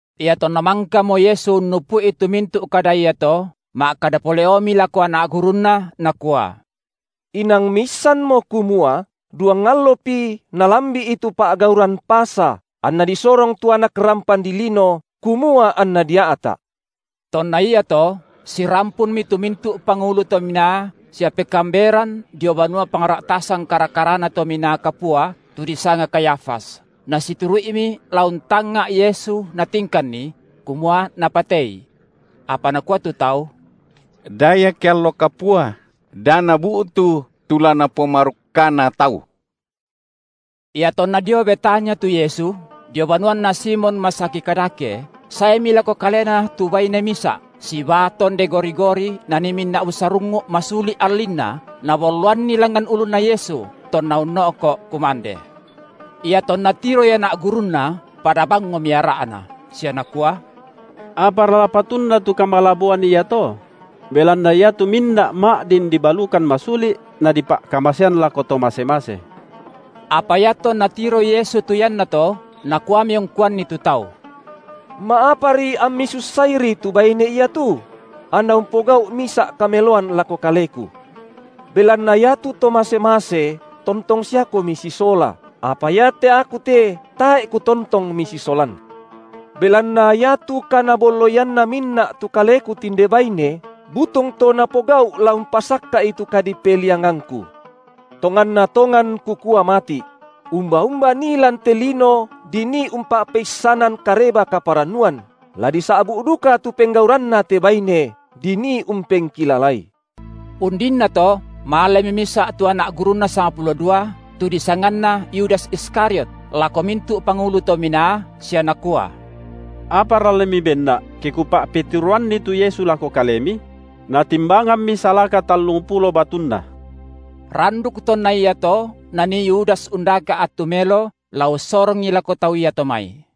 Iatonna mangkamo Yesu unnupu’i tu mintu’ kada iato, ma’kada pole’omi lako anak gurunNa Nakua: Inang miissanmo kumua duang allopi nalambi’i tu pa’gauran Pasa, anNa disorong tu Anak rampan dilino, kumua anNa dia’ta’. Tonna iato sirampunmi tu mintu’ pangulu to minaa sia pekaamberan dio banua pangra’tasan kara-karana Tominaa Kapua, tu disanga Kayafas, nasituru’imi la untangnga’ Yesu natingkanNi, kumua napatei. Apa nakua tu tau: Da ia ke allo kapua, da nabu’tu tu la napomarukkana tau. Iatonna dio Betania tu Yesu, dio banuanna Simon masaki kadake, saemi lako Kalena tu baine misa’, sibaa tonde gori-gori nanii minna’ busarungngu’ masuli’ allinna, nabolloanni langngan ulunna Yesu, tonna unno’ko’ kumande. Iatonna tiroi anak gurunNa pada bangngomi ara’na, sia nakua: Apara patunna tu kamalaboan iato? Belanna iatu minna’ ma’din dibalukan masuli’, nadipa’kamasean lako to mase-mase. Apa iatonna tiroi Yesu tu iannato, Nakuami ungkuanni tu tau: Ma’apari ammi sussairi tu baine iatu? Anna umpogau’ misa’ kameloan lako Kaleku. Belanna iatu to mase-mase tontong siakomi sisola, apa iate Aku te tae’ Kutontong misisolan. Belanna iatu kanabolloianna minna’ tu Kaleku tinde baine butung to napogau’ la umpasakka’i tu kadipe- liangangKu. Tonganna tongan Kukua mati’: Umba-umba nii lan te lino dinii umpa’peissanan Kareba kaparannuan, la disa’bu’ duka tu penggauranna te baine, dinii umpengkilalai. Undinnato malemi misa’ tu anak gurunNa sangpulo dua, tu disanganna Yudas Iskariot, lako mintu’ pangulu to minaa, sia nakua: Apara la mibenna’, ke kupa’peturoanNi tu Yesu lako kalemi? Natimbangammi salaka tallungpulo batunna. Randuk tonna iato nanii Yudas undaka’ attu melo la ussorongI lako tau iato mai.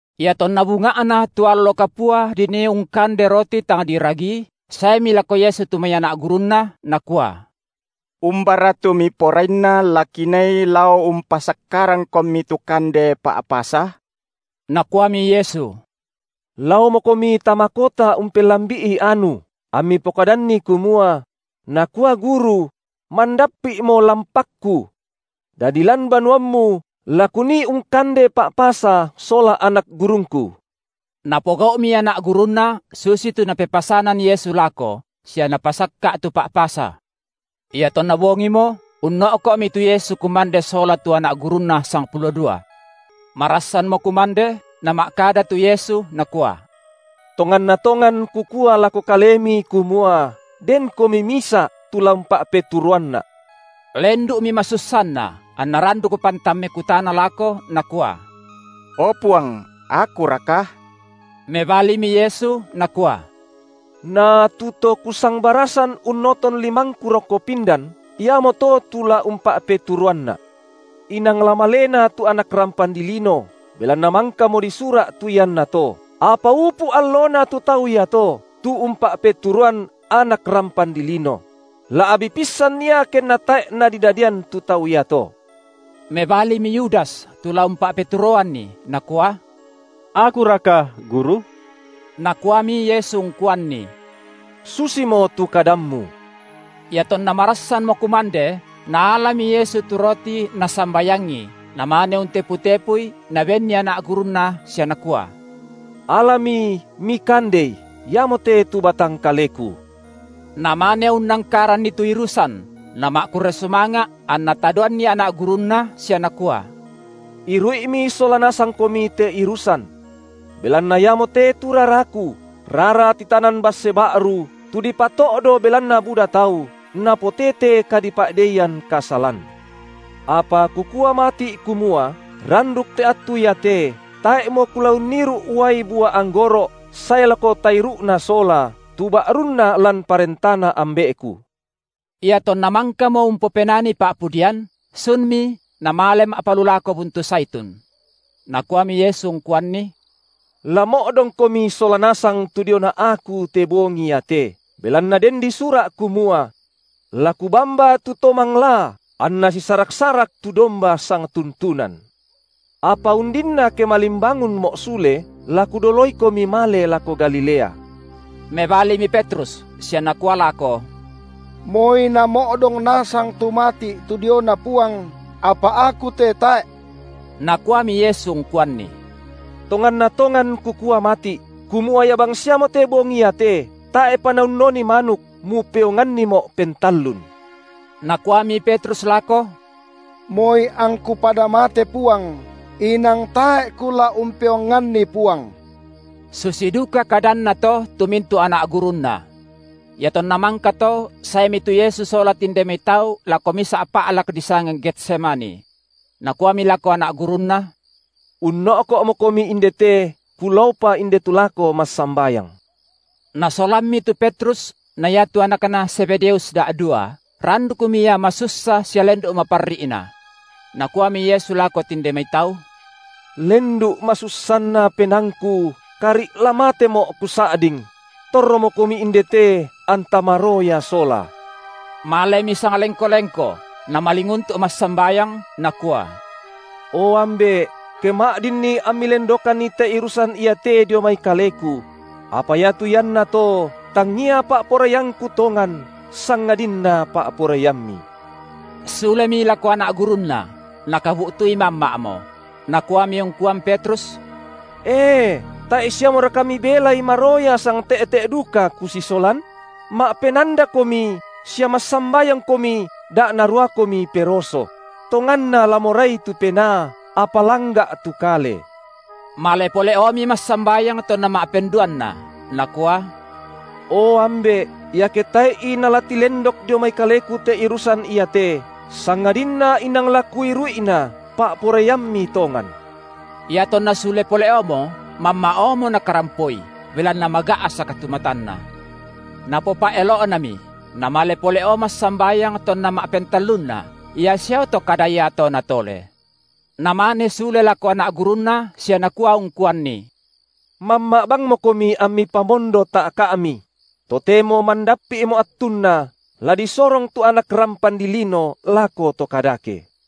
Iatonna bunga’na tu allo kapua dinii ungkande roti tang diragii, saemi lako Yesu tu mai anak gurunNa, nakua: Umbara tu Miporainna la kinii lao umpasakkarangKomi tu kande Pa’pasa? Nakuami Yesu: Laomokomi tama kota umpellambi’i anu, ammi pokadanni kumua: Nakua Guru: mandappi’mo lampakKu; dadi lan banuammu la Kunii ungkande Pa’pasa sola anak gurungKu. Napogau’mi anak gurunNa susitu Napepasanan Yesu lako, sia napasakka’ tu Pa’pasa. Iatonna bongimo, unno’ko’mi tu Yesu kumande sola tu anak gurunNa sangpulo dua. Marassanmo kumande, Nama’kada tu Yesu Nakua: Tonganna tongan Kukua lako kalemi kumua denkomi misa’ tu la umpa’peturoanNa’. Lendu’mi masussanna, anna randuk pantan mekutana lako nakua: O Puang, akuraka? Mebalimi Yesu Nakua: Na tu to Kusangbarasan unnoton limangKu rokko pindan, iamoto tu la umpa’peturoanNa’. Inang la maleNa tu Anak rampan dilino, belanna mangkamo disura’ tu iannato; apa upu’ allona tu tau iato, tu umpa’peturoan Anak rampan dilino! La’bi’pissan ia kenna tae’ nadidadian tu tau iato. Mebalimi Yudas tu la umpa’peturoanNi, nakua: akuraka, Guru? Nakuami Yesu ungkuanni: Susimo tu kadammu. Iatonna marassanmo kumande, Naalami Yesu tu roti Nasambayangi, Namane untepu-tepui Nabenni anak gurunNa sia Nakua: Alami, mikandei, iamote tu batang kaleKu. Namane unnangkaranni tu irusan, Nama’kurre sumanga’ anNa tadoanni anak gurunNa sia Nakua: Iru’imi sola nasangkomi te irusan. Belanna iamote tu raraKu, rara titanan basse ba’ru, tu dipato’do belanna buda tau, napotete kadipa’deian kasalan. Apa Kukua mati’ kumua randuk te attu iate tae’mo Kula unniru’ uai bua anggoro’ sae lako tairu’na sola, tu ba’runna lan parentaNa Ambe’Ku. Iatonna mangkamo umpopenani pa’pudian, sunmi namale ma’palulako buntu Zaitun. Nakuami Yesu ungkuanni: La mo’dongkomi sola nasang tu diona Aku te bongi iate, belanna den disura’ kumua: la Kubamba tu to manglaa, anna sisaraksarak tu domba sangtun- tunan. Apa undinna ke malimbangunMo’ sule, la Kudoloikomi male lako Galilea. Mebalimi Petrus sia nakua lako: Moi namo’dong nasang tu mati’ tu diona Puang, apa aku te tae’. Nakuami Yesu ungkuanni: Tonganna tongan Kukua mati’, kumua ia bangsiamote bongi iate, tae’pa naunnoni manuk, mupeonganniMo’ pentallun. Nakuami Petrus lako: Moi angku pada mate Puang, inang tae’ kula umpeonganni Puang. Susi duka kadanna to tu mintu’ anak gurunNa. Iatonna mangkato saemi tu Yesu sola tinde mai tau lako misa’ pa’lak disanga Getsemani. Nakuami lako anak gurunNa: Unno’ko’mokomi indete, Kulaopa indetu lako massambayang. Nasolammi tu Petrus na iatu anakna Zebedeus da’dua, randukmi Ia masussa sia lendu’ maparri’Na. Nakuami Yesu lako tinde mai tau: Lendu’ masussanna penaangKu kari’ la mateMo’ Kusa’ding; torromokomi indete anta maroya sola. Malemi sanglengko-lengko, Namalinguntu’ massambayang, Nakua: O Ambe’, ke ma’dinni amMi lendokanni te irusan iate dio mai Kaleku; apa iatu iannato tangia pa’poraiangKu tongan, sangadinna pa’poraiamMi. Sulemi lako anak gurunNa, Nakabu’tui mamma’mo; Nakuami ungkuan Petrus: E, tae’ siamoraka mibelai maroya sangte’te’ duka Kusisolan? Ma’penandakomi sia massambayangkomi da naruakomi peroso; tonganna la morai tu penaa, apa langga’ tu kale. Male pole’omi massambayang tonna ma’penduanna, Nakua: O Ambe’, iake tae’i nala tilendok dio mai Kaleku te irusan iate, sangadinna inang la Kuiru’ina, pa’poraiamMi tongan. Iatonna sule pole’omo, mamma’omo Nakarampoi, belanna maga’sak tu matanna. Napopa’elo’nami, Namale pole’o massambayang tonna ma’pentallunna, ia siao to kada iato Natole. Namane sule lako anak gurunNa sia Nakua ungkuanni: Mamma’ bangmokomi ammi pamondo ta’ka’mi; totemo mandappi’mo attunna la disorong tu Anak rampan dilino lako to kadake.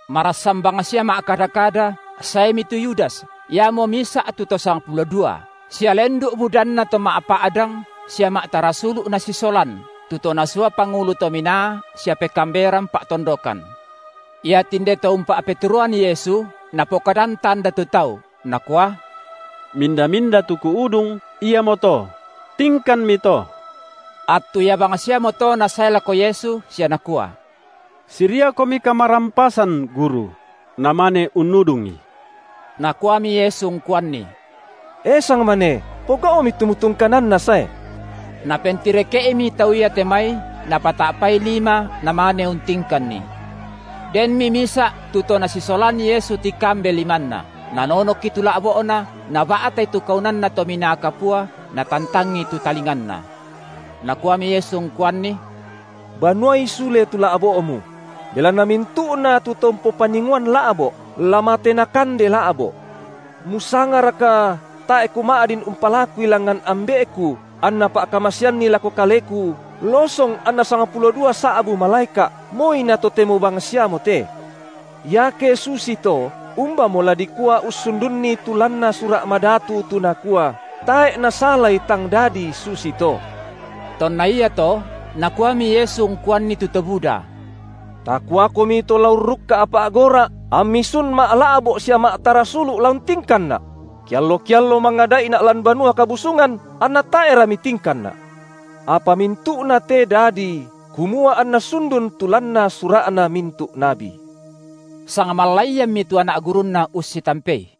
Marassan bangsia ma’kada-kada, saemi tu Yudas, iamo misa’ tu to sangpulo dua, sia lendu’ budanna to ma’pa’dang sia ma’tarasulu’ nasisolan, tu to nasua pangulu to minaa sia pekaamberan pa’tondokan. Iatinde to umpa’peturoan Yesu napokadan tanda tu tau, nakua: Minda-minda tu kuudung, iamoto; tingkanmi to. Attu ia bangsiamoto nasae lako Yesu sia nakua: SiriaKomi kamarampasan, Guru! namane unnudungi. Nakuami Yesu ungkuanni: E sangmane, pogau’mi tu mutungkananna sae. Napentireke’imi tau iate mai napata’pai lima namane untingkanNi. Denmi misa’ tu to nasisolan Yesu tikambe limanna, nanonokki tu la’bo’na, naba’tai tu kaunanna Tominaa Kapua natantangi tu talinganna. Nakuami Yesu ungkuanni: Banuai sule tu la’bo’mu; belanna mintu’na tu to umpopaningoan la’bo’, la mate nakande la’bo’. Musangaraka, tae’ Kuma’din umpa- lakui langngan Ambe’Ku, anNa pa’ka- maseanni lako Kaleku losong anna sangpulo dua sa’bu malaeka’, moi na totemo bangsiamote? Iake susito, umbamo la dikua ussundunni tu lanna Sura’ Madatu tu nakua, tae’ nasalai tang dadi susito? Tonna iato nakuami Yesu ungkuanni tu to buda: Takuakomi to la urrukka’ pa’gora’ ammi sun ma’la’bo’ sia ma’tarasulu’ la untingkanNa’? Keallo-keallo mangada’iNa’ lan Banua Kabusungan, anna tae’ra mitingkanNa’. Apa mintu’na te dadi, kumua anna sundun tu lanna sura’na mintu’ nabi. Sangmallaiammi tu anak gurunNa ussitampei.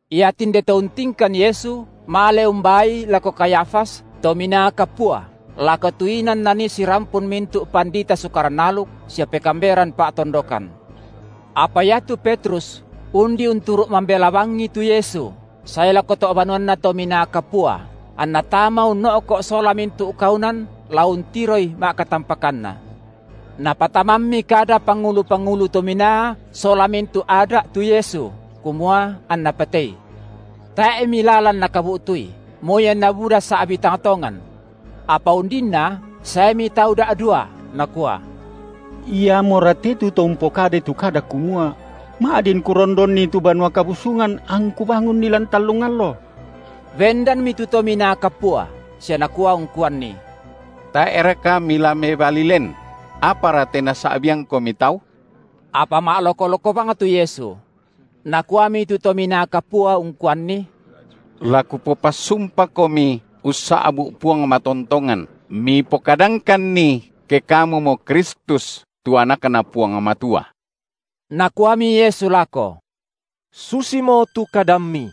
Iatinde to untingkan Yesu, male umbaaI lako Kayafas, Tominaa Kapua, lako tu inan nanii sirampun mintu’ pandita Sukaran aluk sia pekaamberan pa’tondokan. Apa iatu Petrus undi unturu’ mambela bangI tu Yesu, sae lako to’ banuanna Tominaa Kapua, anna tama unno’ko’ sola mintu’ kaunan la untiroi ma’katampakanna. Napatamammi kada pangulu-pangulu to minaa sola mintu’ Ada’ tu Yesu, kumua anna patei; tae’mi lalan nakabu’tui, moi anna buda sa’bi tang tongan. Apa undinna saemi tau da’dua, nakua: Iamora te tu to umpokadai tu kada kumua: Ma’din Kurondonni tu Banua Kabusungan, angKu bangunni lan tallung allo. Bendanmi tu Tominaa Kapua sia nakua ungkuanNi: Tae’raka Mila mebali len? Apara te nasa’biangKomi tau? Apa ma’loko-loko bang tu Yesu. Nakuami tu Tominaa Kapua ungkuanNi: La kupopassumpaKomi ussa’bu’ Puang matontongan Mipokadangkanni ke Kamumo Kristus, tu AnakNa Puang Matua. Nakuami Yesu lako: Susimo tu kadammi.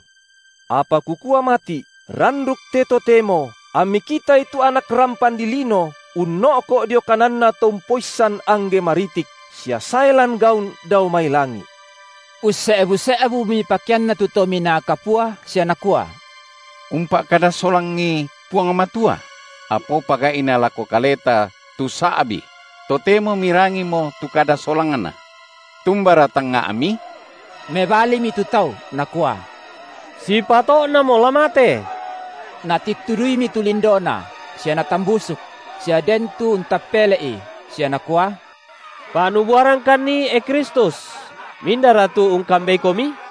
Apa Kukua mati’, randuk te totemo ammi kitai tu Anak rampan dilino unno’ko’ dio kananNa To umpoissan angge maritik, sia sae lan gaun dao mai langi’. Usse’bu-se’bumi pakeanna tu Tominaa Kapua sia nakua: Umpa’kada solangi Puang Matua; apaopa gai’na lako kaleta tu sa’bi? Totemo mirangimo tu kada solangNa. Tumbara tangnga’mi? Mebalimi tu tau, nakua: Sipato’namo la mate. Natittuduimi tu lindoNa, sia natambusuk; sia den tu untappele’I, sia nakua: Pa’nubuarangkanni, e Kristus, mindara tu ungkambeikomi?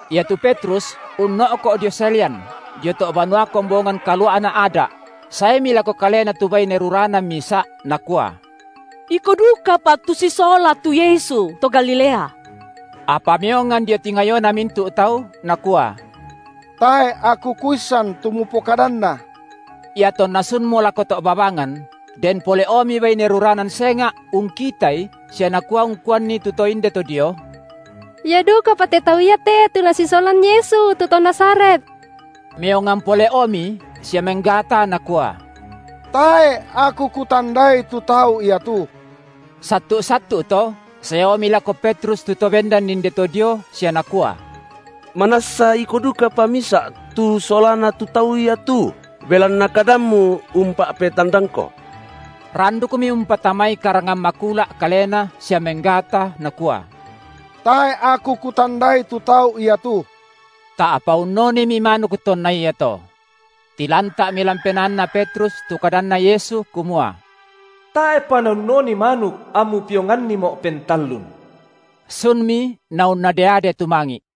Iatu Petrus unno’ko dio salian, dio to’ banua kombongan kalua’na Ada’; saemi lako kalena tu baine ruranan misa’, nakua: Iko dukapa tu sisola tu Yesu, to Galilea. Apa meongan dio tingayona mintu’ tau, nakua: Tae’ aku kuissan tu mupokadanna. Iatonna sunmo lako to’ babangan, den pole’omi baine ruranan senga’ ungkitai sia nakua ungkuanni tu to indeto dio: Ia dukapa te tau iate tu nasisolan Yesu, tu to Nazaret. Meongan pole’omi sia menggata nakua: Tae’ aku kutandai tu tau ia tu. Sattu’-sattu’ to saeomi lako Petrus tu to bendan indeto dio sia nakua: Manassa iko dukapa misa’ tu solana tu tau ia tu, belanna kadammu umpa’petandangko. Randukmi umpatamai karangan makula’ kalena sia menggata nakua: Tae’ aku kutandai tu tau ia tu. Ta’pa unnonimi manuk tonna iato. Tilanta’mi lan penaanna Petrus tu kadanNa Yesu kumua: Tae’pa naunnoni manuk, ammu peonganniMo’ pentallun. Sunmi naunnade-ade tumangi’.